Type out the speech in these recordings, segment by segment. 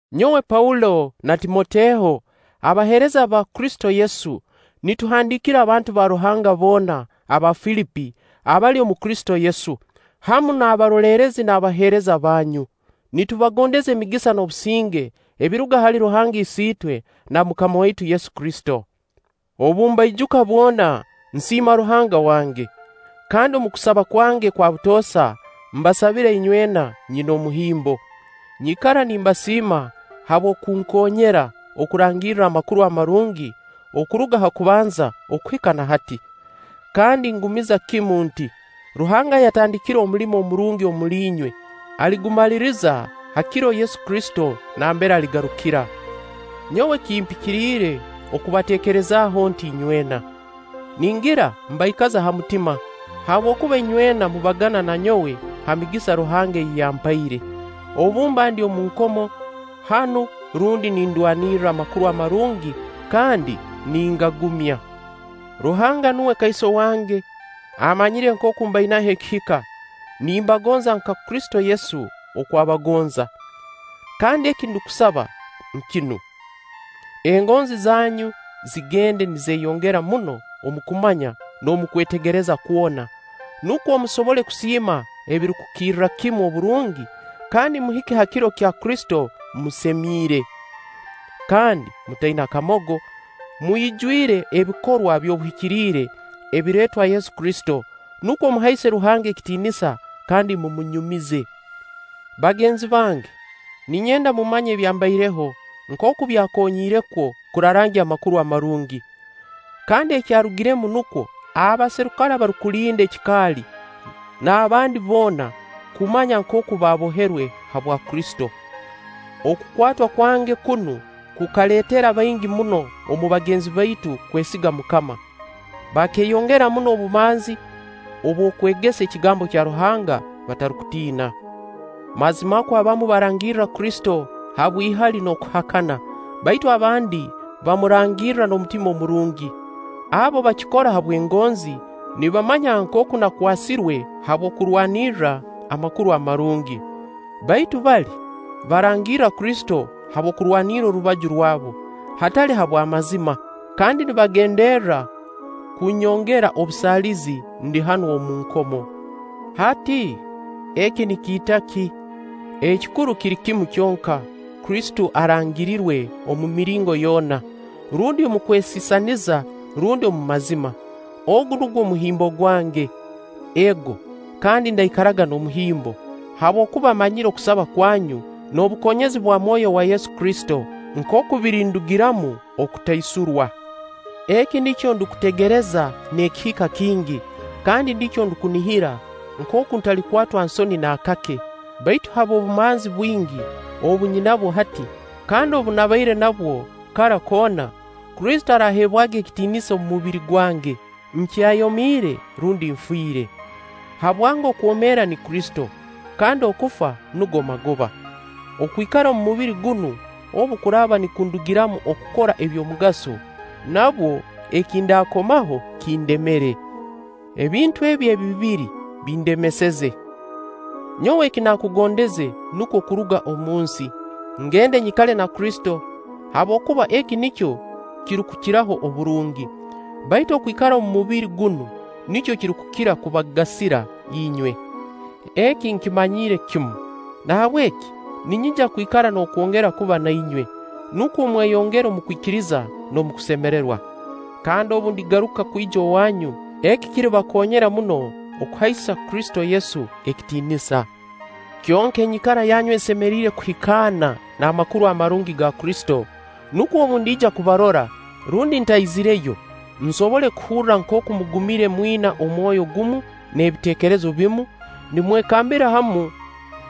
Nyowe Paulo na Timoteho, abaheereza ba Kristo Yesu, nituhandiikira abantu ba Ruhanga boona aba Filipi abali omu Kristo Yesu, hamu n'abaroleerezi n'abaheereza bunyu. Nitubagondeza emigisa n'obusinge ebiruga hali Ruhanga Isiitwe na MUKAMA waitu Yesu Kristo. Obu mbaijuka bwona, nsiima Ruhanga wange. Kandi omu kusaba kwange kwa butoosa mbasabira inywena nyina omuhimbo. Nyikara nimbasiima habw'okunkoonyera okurangirra Amakuru Amarungi okuruga ha kubanza okuhika na hati. Kandi ngumiza kimu nti: Ruhanga ayatandikire omulimo omurungi omuli inywe, aligumaliriza ha Kiro Yesu Kristo nambere aligarukira. Nyowe kimpikiriire okubateekerezaaho nti inywena. Ningira mbaikaza ha mutima, habwokuba inywena mubagana na nyowe ha migisa Ruhanga ei yampaire, obu mba ndi omu nkomo hanu rundi nindwanirra Amakuru Amarungi kandi ningagumya. Ruhanga nuwe kaiso wange, amanyire nkooku mbainaho ekihika, nimbagonza nka Kristo Yesu oku abagonza. Kandi eki ndukusaba nkinu: engonzi zanyu zigende nizeeyongera muno omu kumanya n'omu kwetegereza kwona, nukwo musobole kusiima ebirukukirra kimu oburungi kandi muhike ha Kiro kya Kristo musemiire kandi mutaina kamogo, mwijwire abikorwa by'obuhikiriire ebireetwa Yesu Kristo, nukwo muhaise Ruhanga ekitiinisa kandi mumunyumize. Bagenzi bange, ninyenda mumanye ebyambaireho nkooku byakonyiire kwo kurarangya Amakuru Amarungi. Kandi ekyarugiremu nukwo abaserikale abarukulinda ekikaali n'abandi boona kumanya nkooku naboherwe habwa Kristo. Okukwatwa kwange kunu kukaleetera baingi muno omu bagenzi baitu kwesiga MUKAMA, bakeeyongera muno obumanzi obw'okwegesa ekigambo kya Ruhanga batarukutiina. Mazimakwo abamu barangirra Kristo habw'ihali n'okuhakana; baitu abandi bamurangirra n'omutima murungi. Abo bakikora habw'engonzi, nibamanya nkooku nakwasirwe habw'okurwanirra Amakuru Amarungi. Baitu bali, barangirra Kristo habw'okurwanirra orubaju rwabu, hatali habw'amazima; kandi nibagenderra kunyongera obusaalizi ndi hanu omu nkomo Hati, eki nikiita ki? Ekikuru kiri kimu kyonka, Kristo arangirirwe omu miringo yoona: rundi omu kwesisaniriza, rundi omu mazima. Ogu nugwo muhimbo gwange. Ego, kandi ndaikaraga n'omuhimbo, habwokuba mmanyire okusaba kwanyu n'obukoonyezi bwa Mwoyo wa Yesu Kristo nkooku birindugiramu okutaisurwa. Eki nikyo ndukutegereza n'ekihika kingi, kandi nikyo ndukunihira, nkooku ntalikwatwa nsoni naakake, baitu habw'obumanzi bwingi obu nyinabwo hati, kandi obu nabaire nabwo kara koona, Kristo araaheebwaga ekitiinisa omu mubiri gwange, nkyayomiire rundi nfire. Habwange okwomeera ni Kristo, kandi okufa nugo magoba. Okwikara omu mubiri gunu, obu kuraaba nikundugiramu okukora eby'omugaso, nabwo eki ndaakomaho kindemere. Ebintu ebi ebibiri bindemeseze. Nyowe ekinakugondeze nukwo kuruga omunsi, ngende nyikale na Kristo; habwokuba eki nikyo kirukukiraho oburungi. Baitu okwikara omu mubiri gunu, nikyo kirukukira kubagasira inywe. Eki nkimanyiire kimu, nahabweki ninyija kwikara n'okwongera kuba nainywe, nukwo mweyongere omu kwikiriza n'omu kusemererwa. Kandi obu ndigaruka kwija owaanyu, eki kiribakoonyera muno okuhaisa Kristo Yesu ekitiinisa. Kyonka enyikara yanyu esemeriire kuhikaana n'Amakuru Amarungi ga Kristo, nukwo obu ndiija kubarora, rundi ntaizireyo, nsobole kuhurra nkooku mugumire mwina omwoyo gumu n'ebiteekerezo bimu, nimwekambira hamu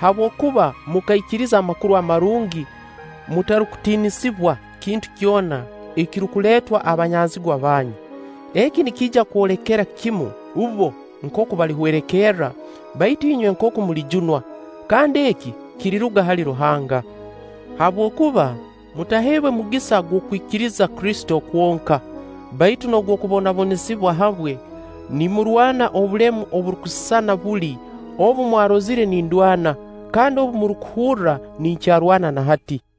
habwokuba mukaikiriza Amakuru Amarungi, mutarukutiinisibwa kintu kyona ekirukuleetwa abanyazigwa banyu. Eki nikiija kwolekera kimu bbo nkooku balihwerekerra, baitu inywe nkooku mulijunwa; kandi eki kiriruga hali Ruhanga. Habwokuba mutaheebwe mugisa gw'okwikiriza Kristo kwonka, baitu n'ogw' okubonabonesibwa habwe, nimurwana obulemu oburukusisana buli, obu mwarozire nindwana, kandi obu murukuhurra ninkyarwana na hati.